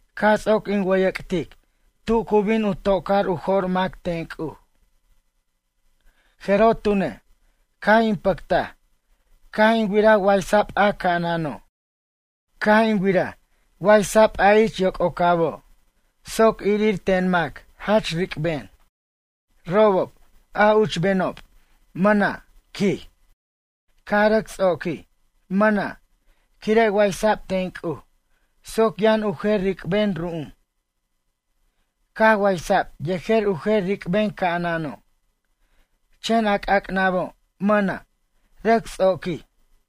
Caj ts'oc in wʌyʌc'tic tu cu bin u to'car u jo'r mac ten C'uj. Jeroj tune', caj in pʌctaj caj in wiraj waysa'b a ca'anano'. Caj in wiraj waysa'b a ich yoc'ocabo' soc irir ten mac jach ric'ben. Robob, a uchbenob mʌna', quij, caj rʌc ts'oquij, mʌna', quire' waysa'b ten C'uj soc yʌn u jer ric'ben ru'um. Caj waysa'b yejer u jer ric'ben ca'anano', chen a c'ac'nabo' mʌna', rʌc ts'oquij.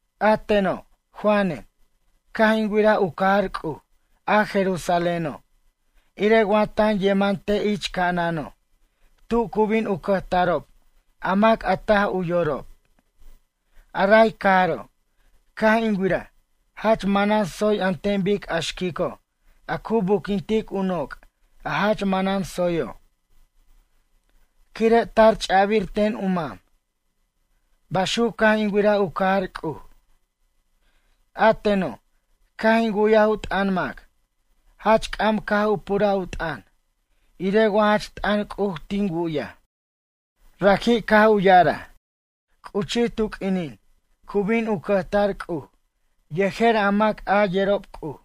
A teno', Juanen, caj in wiraj u cajar C'uj, a Jerusaléno', irej wa tan yeman te' ich ca'anano', tu cu bin u cʌjtarob a mac a taj u yorob. A ray cajaro', caj in wiraj jach manan tsoy an ten bic a xquico' a cu buquintic u noc' a jach manan tsoyo', quire' tar ch'abir ten u mam. Baxuc, caj in wiraj u cajar C'uj. A teno', caj in wu'yaj u t'ʌn mac, jach c'am caj u puraj u t'ʌn irej wa jach t'ʌn C'uj tin wu'yaj. Raji' caj u ya'araj: ―C'uchij tu q'uinin cu bin u cʌjtar C'uj yejer a mac a yerob C'uj.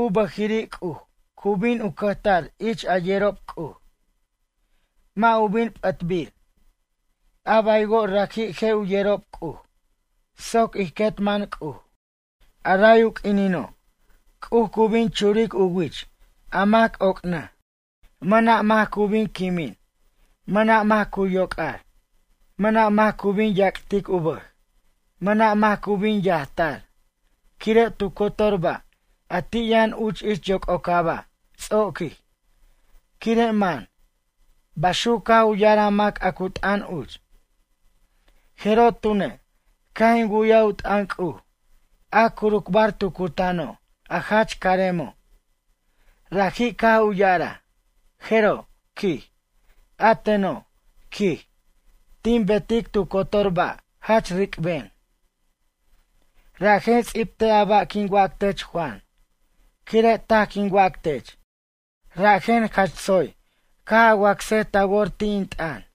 U bʌjiri' C'uj cu bin u cʌjtar ich a yerob C'uj. Mʌ' u bin p'ʌtbir, a baywo' raji' je' u yerob C'uj soc ij quet man C'uj. A ray u q'uinino', C'uj cu bin churic u wich a mac oc'nʌj. Mʌna' mac cu bin quimin, mʌna' mac cu yoc'ar, mʌna' mac cu bin yac'tic u bʌj, mʌna' mac cu bin yajtar. Quire' tu cotor ba' a ti' yʌn uch ich yoc'ocaba' ts'oquij, quire' man ―baxuc caj u ya'araj a mac a cu t'ʌn uch. Jeroj tune', caj in wu'yaj u t'ʌn C'uj, a curucbar tu cutano', a jach caremo'. Raji' caj u ya'araj: ―Jeroj ―quij―, a teno' ―quij―, tin betic tu cotor ba' jach ric'ben. Rajen ts'ibtej a ba' quin wac tech Juan, quire' taj quin wac tech, rajen jach tsoy caj a wacsej ta wor ti' in t'ʌn.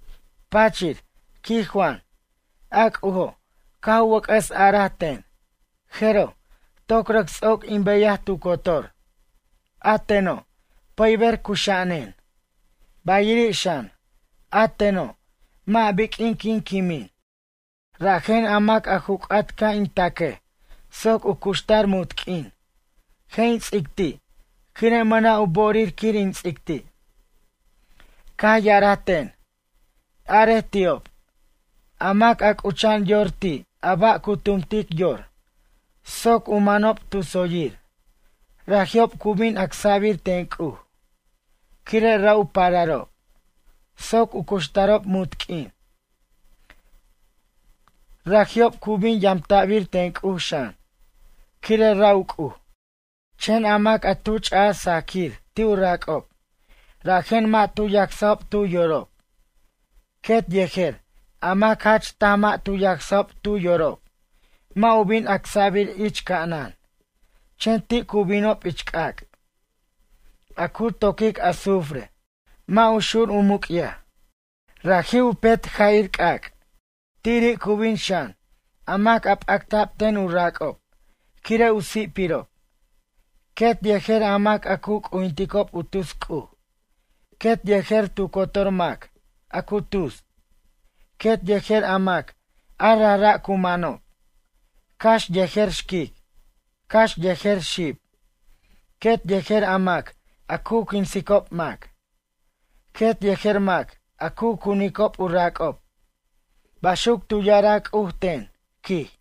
Pachir, quij Juan, a C'ujo' caj u wʌc'ʌs araj ten: ―Jeroj, toc rʌc ts'oc in beyaj tu cotor. A teno', pʌyber cuxa'anen, bayiri' xan, a teno', mʌ' biq'uin quin quimin. Rajen a mac a ju c'at ca' in taquej soc u cuxtar munt q'uin, je' in ts'ic ti', quire' mʌna' u bo'orir quir in ts'ic ti'. Caj ya'araj ten: ―Arej ti'ob, a mac a c'ucha'an yor ti' a ba' cu tumtic yor soc u manob tu tsoyir raji'ob cu bin acsa'bir ten C'uj, quire' ra' u pararob, soc u cuxtarob munt q'uin. Raji'ob cu bin yamta'bir ten C'uj xan, quire' ra' u C'uj. Chen a mac a tu ch'aj sajquir ti' u rac'ob, rajen mʌ' tu yacsajob tu yorob, quet yejer a mac jach taj mʌ' tu yacsajob tu yorob mʌ' u bin acsa'bir ich ca'anan chen ti' cu binob ich c'ac', a cu toquic azufre, mʌ' u xur u muc'yaj. Raji' u petja'ir c'ac'. Tiri' cu bin xan, a mac a p'acta'b ten u rac'ob quir u si'pirob, quet yejer a mac a cu c'ujinticob u tus c'uj, quet yejer tu cotor mac a cu tus, quet yejer a mac a rajra' cu manob, cax yejer xquic, cax yejer xib, quet yejer a mac a cu quinsicob mac, quet yejer mac a cunicob u rac'ob ―baxuc tu ya'araj C'uj ten, quij.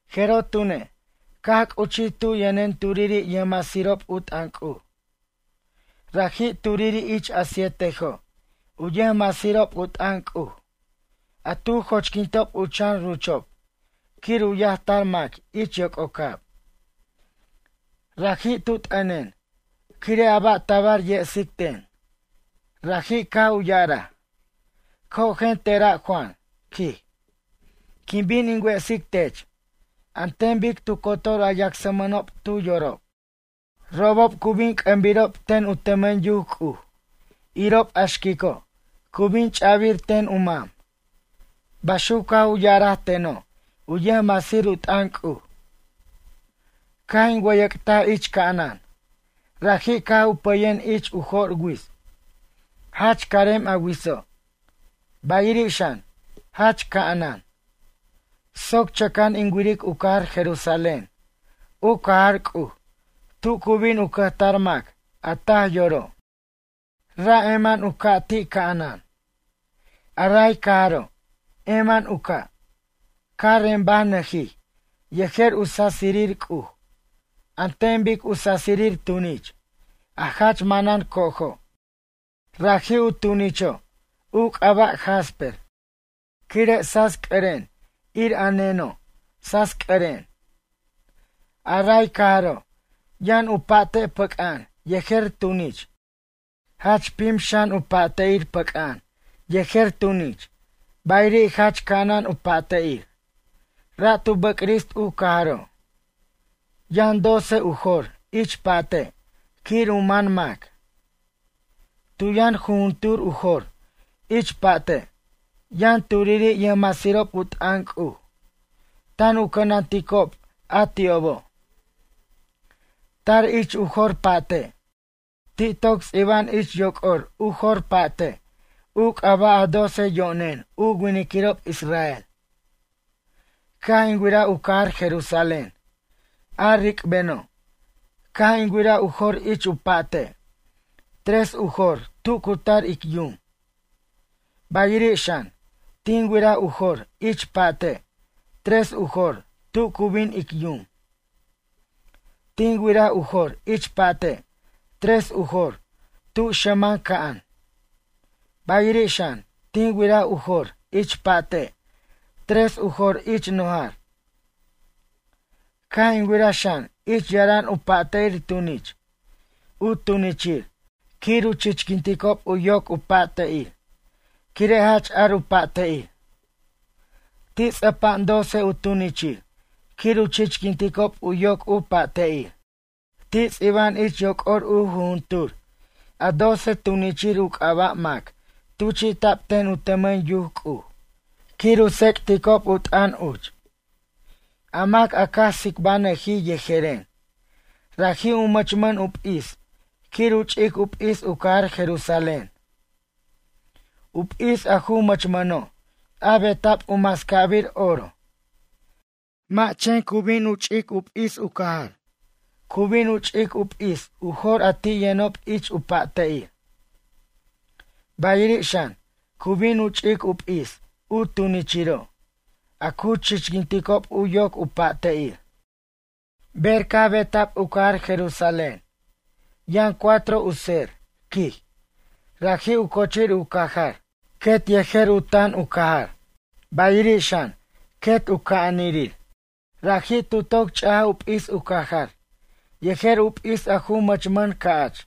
Jeroj tune', caj c'uchij tu yʌnen turiri' yʌjmasirob u t'ʌn C'uj. Raji' turiri' ich a sietejo' u yʌjmasirob u t'ʌn C'uj a tu joch'quintob u chan ruchob quir u yajtar mac ich yoc'ocab. Raji' tu t'ʌnen quire' a ba' tabar yesic ten. Raji' caj u ya'araj: ―Cojen tera' Juan ―quij―. Quin bin in wesic tech an ten bic tu cotor a yacsmʌnob tu yorob. Robob cu bin c'ʌmbirob ten u tʌmʌn yuc C'uj irob a xquico' cu bin ch'a'bir ten u mam ―baxuc caj u ya'araj teno' u yʌjmasir u t'ʌn C'uj. Caj in wʌyʌc'taj ich ca'anan, raji' caj u pʌyen ich u jo'r wits. Jach carem a witso', bayiri' xan, jach ca'anan. Soc chʌca'an in wiric u cajar Jerusalén, u cajar C'uj tu cu bin u cʌjtar mac a taj yoro'. Ra' eman u ca' ti' ca'anan. A ray cajaro', eman u ca', caj rembanʌjij yejer u sasirir C'uj an ten bic u sasirir tunich, a jach manan co'ojo'. Raji' u tunicho', u c'aba' jasper, quire' sasc'ʌren ir a neno' sasc'ʌren. A ray cajaro', yʌn u pa'te' pʌc'a'an yejer tunich, jach pim xan u pa'te'ir pʌc'a'an yejer tunich, bayiri' jach ca'anan u pa'te'ir. Ra' tu bʌcrist u cajaro'. Yʌn doce u jor ich pa'te' quir u man mac. Tu yʌn jujuntur u jor ich pa'te', yʌn turiri' yʌjmasirob u t'ʌn C'uj tan u cʌnanticob a ti'obo'. Tar ich u jor pa'te', ti' toc ts'iba'an ich yoc'or u jor pa'te' u c'aba' a doce yo'nen u winiquirob israel. Caj in wiraj u cajar Jerusalén, a ric'beno', caj in wiraj u jor ich u pa'te', tres u jor tu cu tar ic yum. Bayiri' xan, tin wiraj u jor ich pa'te', tres u jor tu cu bin ic yum. Tin wiraj u jor ich pa'te', tres u jor tu xʌman ca'an, bayiri' xan, tin wiraj u jor ich pa'te', tres u jor ich nojar. Caj in wiraj xan ich yaran u pa'te'ir tunich, u tunichir quir u chichquinticob u yoc u pa'te'ir, quire' jach ar u pa'te'ir. Ti' ts'ʌpa'an doce u tunichir quir u chichquinticob u yoc u pa'te'ir. Ti' ts'iba'an ich yoc'or u jujuntur a doce tunichir u c'aba' mac tuchi'ta'b ten u tʌmʌn yac C'uj quir u tsec'ticob u t'ʌn uch. A mac a caj tsibanʌjij yejeren, raji' u mʌchmʌn u p'is quir u ch'ic u p'is u cajar Jerusalén. U p'is a ju mʌchmʌno' a beta'b u mascabir oro. Mʌ' chen cu bin u ch'ic p'is u cajar, cu bin u ch'ic u p'is u jor a ti' yʌnob ich u pa'te'ir. Bayiri' xan, cu bin u ch'ic u p'is u tunichiro', a cu chichquinticob u yoc u pa'te'ir. Ber caj beta'b u cajar Jerusalén, yʌn cuatro u tser, quij, raji' u cochir u cajar quet yejer u tan u cajar, bayiri' xan, quet u ca'anirir. Raji' tu toc ch'aj u p'is u cajar yejer u p'is a ju mʌmʌn ca'ch,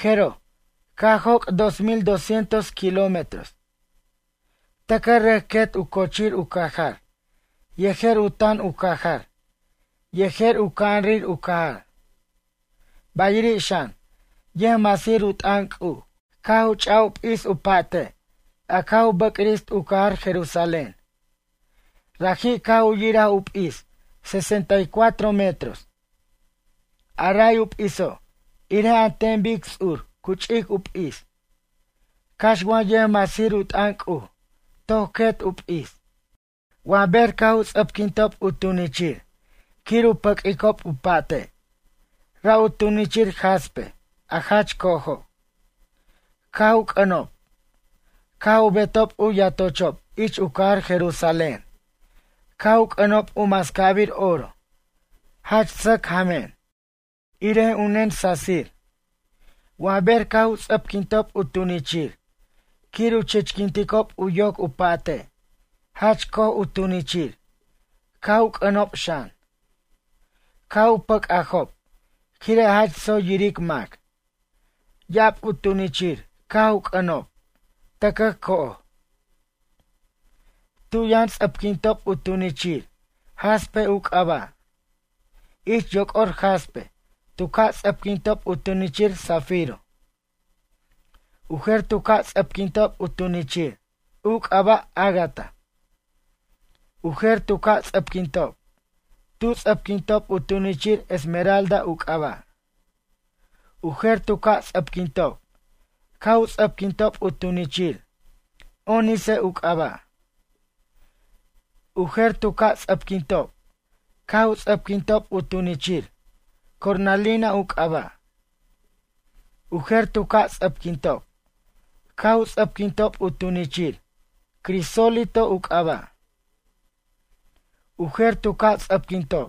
jeroj, caj joc' dos mil doscientos kilómetros. Tʌcʌj rʌc quet u cochir u cajar yejer u tan u cajar yejer u ca'anrir u cajar. Bayiri' xan, yʌjmasir u t'ʌn C'uj, caj u ch' u p'is u pa'te' a caj u bʌcrist u cajar Jerusalén. Raji' caj u yiraj u p'is sesenta y cuatro metros. A ray u p'iso' irej an ten bic ts'ur cu ch'ic u p'is, cax wa yʌjmasir u t'ʌn C'uj, toc quet u p'is. Wa ber caj u ts'ʌpquintob u tunichir quir u pʌq'uicob u pa'te', ra' u tunichir jaspe, a jach co'ojo', caj u c'ʌnob. Caj u betob u yatochob ich u cajar Jerusalén, caj u c'ʌnob u mascabir oro jach sʌc jamen, irej u nen sasir. Wa ber caj u ts'ʌpquintob u tunichir quir u chichquinticob u yoc u pa'te', jach co'oj u tunichir caj u c'ʌnob xan. Caj u pʌc'ajob quire' jach tsoy yiric mac. Ya'ab u tunichir caj u c'ʌnob, tʌcʌj co'oj. Tu yʌn ts'ʌpquintob u tunichir, jaspe u c'aba'. Ich yoc'or jaspe tu ca' ts'ʌpquintob u tunichir zafiro. U jer tu ca' ts'ʌpquintob u tunichir, u c'aba' ágata. U jer tu ca' ts'ʌpquintob, tu ts'ʌpquintob u tunichir, esmeralda u c'aba'. U jer tu ca' ts'ʌpquintob, caj u ts'ʌpquintob u tunichir, ónice u c'aba'. U jer tu ca' ts'ʌpquintob caj u ts'ʌpquintob u tunichir, cornalina u c'aba'. U jer tu ca' ts'ʌpquintob caj u ts'ʌpquintob u tunichir, crisólito u c'aba'. U jer tu ca' ts'ʌpquintob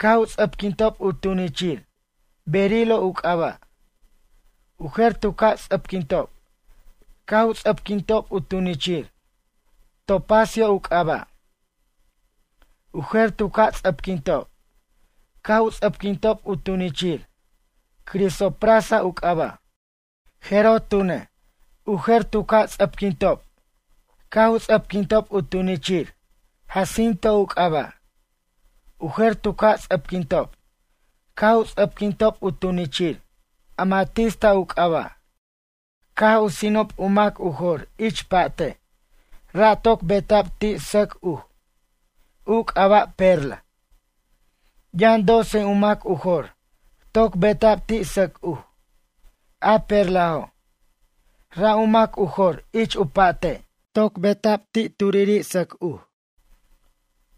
caj u ts'ʌpquintob u tunichir, berilo u c'aba'. U jer tu ca' ts'ʌpquintob caj u ts'ʌpquintob u tunichir, topacio u c'aba'. U jer tu ca' ts'ʌpquintob caj u ts'ʌpquintob u tunichir, crisoprasa u c'aba'. Jeroj tune', u jer tu ca' ts'ʌpquintob caj u ts'ʌpquintob u tunichir, jacinto u c'aba'. U jer tu ca' ts'ʌpquintob caj u ts'ʌpquintob u tunichir, amatista u c'aba'. Caj u sinob u mac u jor ich pa'te', ra' toc beta'b ti' sʌc uj, u c'aba' perla. Yʌn doce u mac u jor toc beta'b ti' sʌc uj, a perlajo'. Ra' u mac u jor ich u pa'te' toc beta'b ti' turiri' sʌc uj.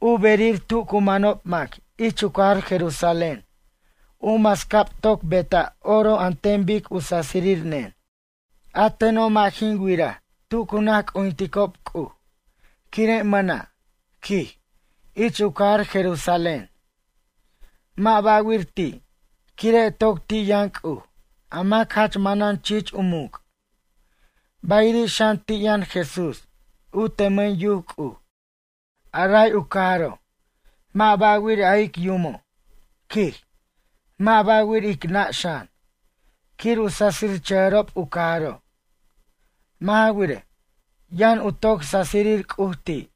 U berir tu cu manob mac ich u cajar Jerusalén u mascab toc beta' oro an ten bic u sasir nen. A teno', mʌ' jin wiraj tu cu naj c'ujinticob C'uj, quire' mʌna', quij, ich u cajar Jerusalén. Mʌ' ba'wir ti', quire' toc ti' yʌn C'uj, a mac jach manan chich u muc', bayiri' xan ti' yʌn Jesús u tʌmʌn yuc C'uj. A ray u cajaro', mʌ' ba'wir a ic yumo', quij, mʌ' ba'wir ic nʌ' xan, quir u sasichʌjʌrob u cajaro'. Mʌ' ja wirej, yʌn u toc sasirir C'uj ti',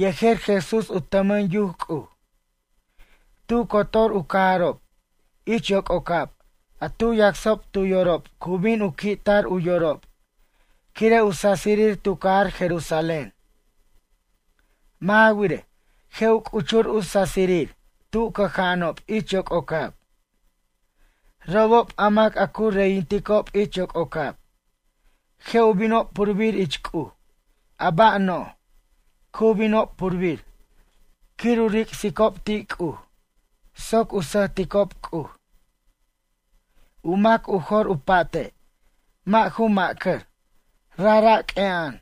yejer Jesús u tʌmʌn yuc C'uj. Tu cotor u cajarob ich yoc'ocab a tu yacsob tu yorob cu bin u qui'tar u yorob quire' u sasirir tu cajar Jerusalén. Mʌ' ja wirej, je' u c'uchur u sasirir tu cʌja'anob ich yoc'ocab. Robob a mac a cu reyinticob ich yoc'ocab je' u binob purbir ich C'uj a ba' no'j, cu binob purbir quir u ric'sicob ti' C'uj soc u sʌjticob C'uj. U mac u jor u pa'te' mʌ' ju macʌr, rajra' q'ue'a'an,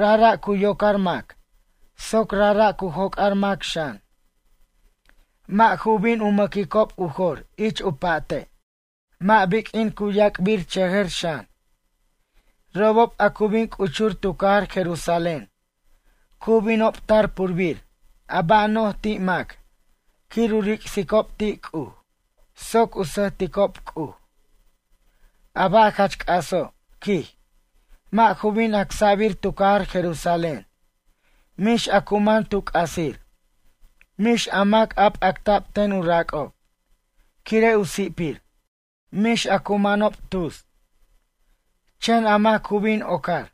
rajra' cu yocar mac soc rajra' cu joc'ar mac xan. Mʌ' ju bin u mʌquicob u jor ich u pa'te'. Mʌ' biq'uin cu yac'birchʌjʌr xan. Robob a cu bin c'uchur tu cajar Jerusalén cu binob tar purbir a ba' no'j ti' mac quir u ric'sicob ti' C'uj soc u sʌjticob C'uj. A ba' jach c'aso', quij, mʌ' ju bin acsa'bir tu cajar Jerusalén, mix a cu man tu c'asir, mix a mac a p'acta'b ten u rac'ob, quire' u si'pir, mix a cu manob tus. Chen a mac cu bin ocar,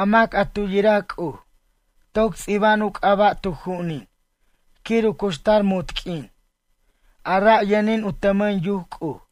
a mac a tu yiraj C'uj toc ts'iba'an u c'aba' tu ju'unin quir u cuxtar munt q'uin, a ra' yʌnin u tʌmʌn yuc C'uj.